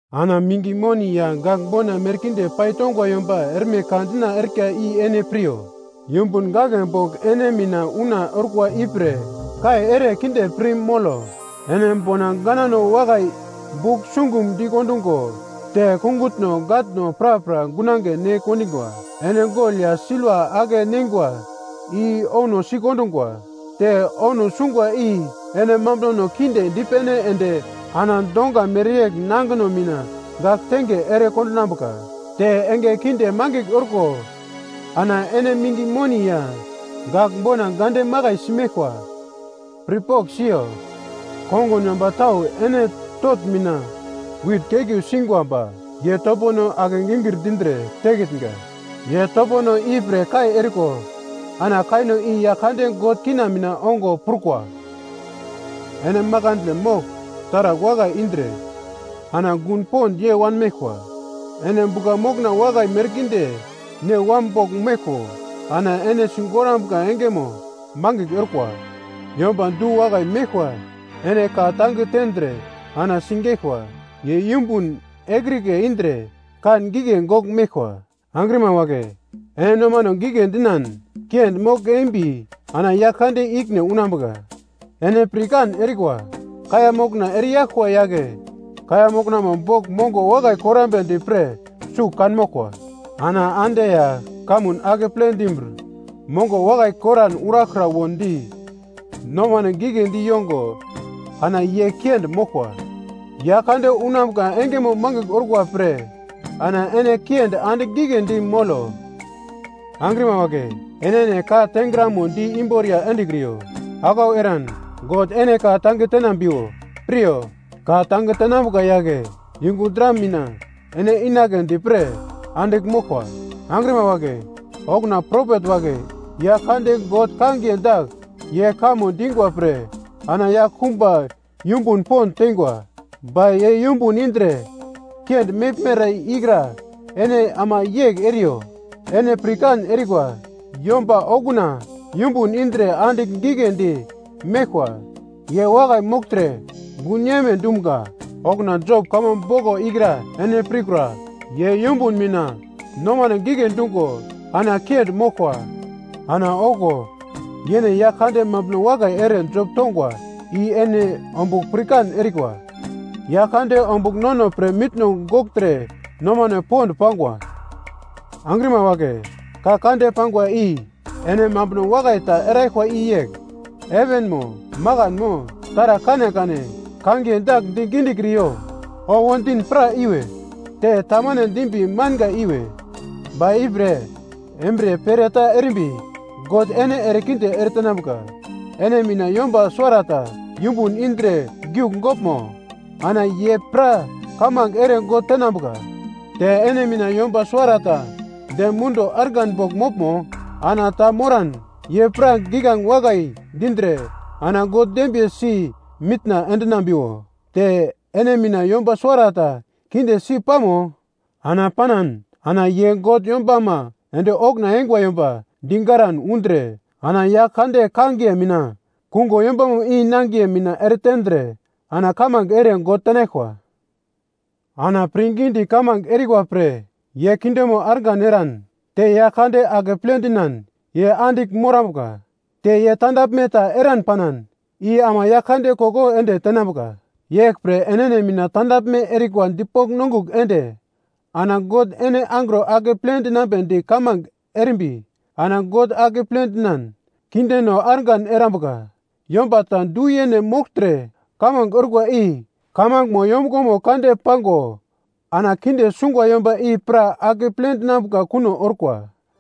Ana minge moni ya gagl bona merkinde paitongwa yomba erme ka dina erika i ene piryo. Yumbun gaglebogl ene mina una orkwa ipre kai ere kinde pir molo. Ene bona ganano wakai bugl sungum dikondungo te kungutno gatno prapra gunange ne kendingwa. Ene gol ya silva ake-neingwa i ouno sikondingwa. Te ouno singwa i ene mambunono kinde dipene ende ana donga mereyegl nangino mina gagltenge ere kondinambuka. Te enge keunde mangigl orko ana ene minge moni ya gagl bona gande makaisi meglkwa. Pirpogl siyo, kongun yomba tau ene totn mina wit keglu singwa ba ye topono ake-gingir dindre tekitnga. Ye topono ipre kai eriko ana kaino i Yaglkande God kina mina ongo prukwa. Ene makandle mogl taragl wakai indre ana gun pond yei wanmeglkwa. Ene bugla mokna wakai merkinde ne wam bogl meglko ana ene sigorambuka engemo mangigl orkwa. Yomba du-wakai meglkwa ene ka-tange tendre ana sigeglkwa. Ye yumbun ekrike indre kan gigle gogl meglkwa. Angrima wagle ene nomano gigle dinan kiendi mogl-embi ana Yaglkande ikine unambuka. Ene pirkan erikwa kaiya mokna ereyaglkwa yagle kaiya moknamo bogl mongo wakai korambedi pre sugl kanmoglkwa. Ana ande ya kamun akeple dimbir mongo wakai koran uraglkra wondi, nomane giglendi yongo ana ye kiendi moglkwa. Yaglkande unambuka engemo mangigl orkwa pre ana ene kiendi andigl giglendi molo. Angrima wagle, enene ka tengramo di-imborya endekriyo. Aglau eran God ene ka-tange te dinambiwo. piryo, ka tange tenambuka yagle yungu dra mina ene inagledi pre andigl moglkwa. Angrima wagle, okuna propet wagle Yaglkande God kangiye dagl ye kamo dingwa pre ana yaglkumba yumbun pond teingwa, ba ye yumbun indre kiendi meglmere ikra ene ama yegl eriyo. Ene pirkan erikwa, yomba okuna yumbun indre andigl giglendi meglkwa ye wakai mogltre gun yeime dumga. Okuna Job kamo boglo ikra ene pirkura. Ye yumbun mina nomane gigle dungo ana kiendi moglkwa ana okuwo yene Yaglkande mambuno wakai ere Job tongwa i ene ombugl pirkan erikwa. Yaglkande ombugl nono pre mitno gogltre nomane pond pangwa. Angrima wagle, ka kande pangwa i, ene mambuno wakai ta eraglkwa i yegl heven mo, makan mo taragl kanekane kangiye dagl di gidi dikriyo. Owo din pra iwe, te tamane dimin manga iwe. Ba ipre embriye pere ta erimbi God ene erekinde eretenambuka. Ene mina yomba suwarata yumbun indre giugogl moglmo? Ana ye pra kamange ere God tenambuka. Te ene mina yomba suwarata dem munduwo argan bogl moglmo? Ana ta moran ye pra giglange wakai dindre ana God dembiye si mitna endinambiwo. Te ene mina yomba suwarata kinde si pamo? Ana panan ana ye God yombama ende okuna eingwa yomba digaran undre ana Yaglkande kangiye mina kungo yombamo i nangiye mina ere tendre ana kamange ere God tenaglkwa. Ana pirngidi kamange erikwa pre ye kindemo argan eran, te Yaglkande akeple dinan ye andigl morambuka, te ye tandaglme ta eran panan i ama Yaglkande koko ende tenambuka. Yeglpre enene mina tandaglme erikwa dipogl nongugl ende ana God ene angro akeple dinambedi kamange erimbi ana God akeple dinan kindeno argan erambuka. Yomba ta du-yene mogltre kamange orkwa i kamangemo yombuglo kande pango ana kinde sungwa yomba i pra akeple dinambuka kuno orkwa.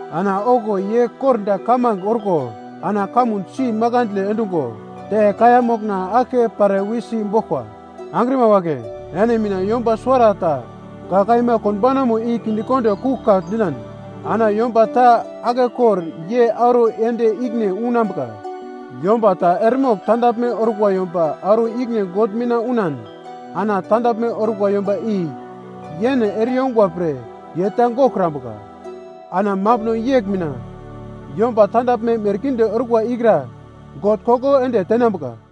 Ana okuwo ye kordagl kamange orko ana kamun si makandle endungo, te kaiya mokna aglke pare wisi boglkwa. Angrima wagle, ene mina yomba suwarata ka kaima konbaunamo i kinde kondo kuglkagl dinan, ana yomba ta aglke kor ye auro yend ikine unambuka. Yomba ta eremogl tandaglme orkwa yomba auro ikine God mina unan ana tandaglme orkwa yomba i yene ere-yungwa pre ye ta goglkrambuka. Ana mambuno yegl mina yomba tandaglme merkinde orkwa ikra God koko ende tenambuka.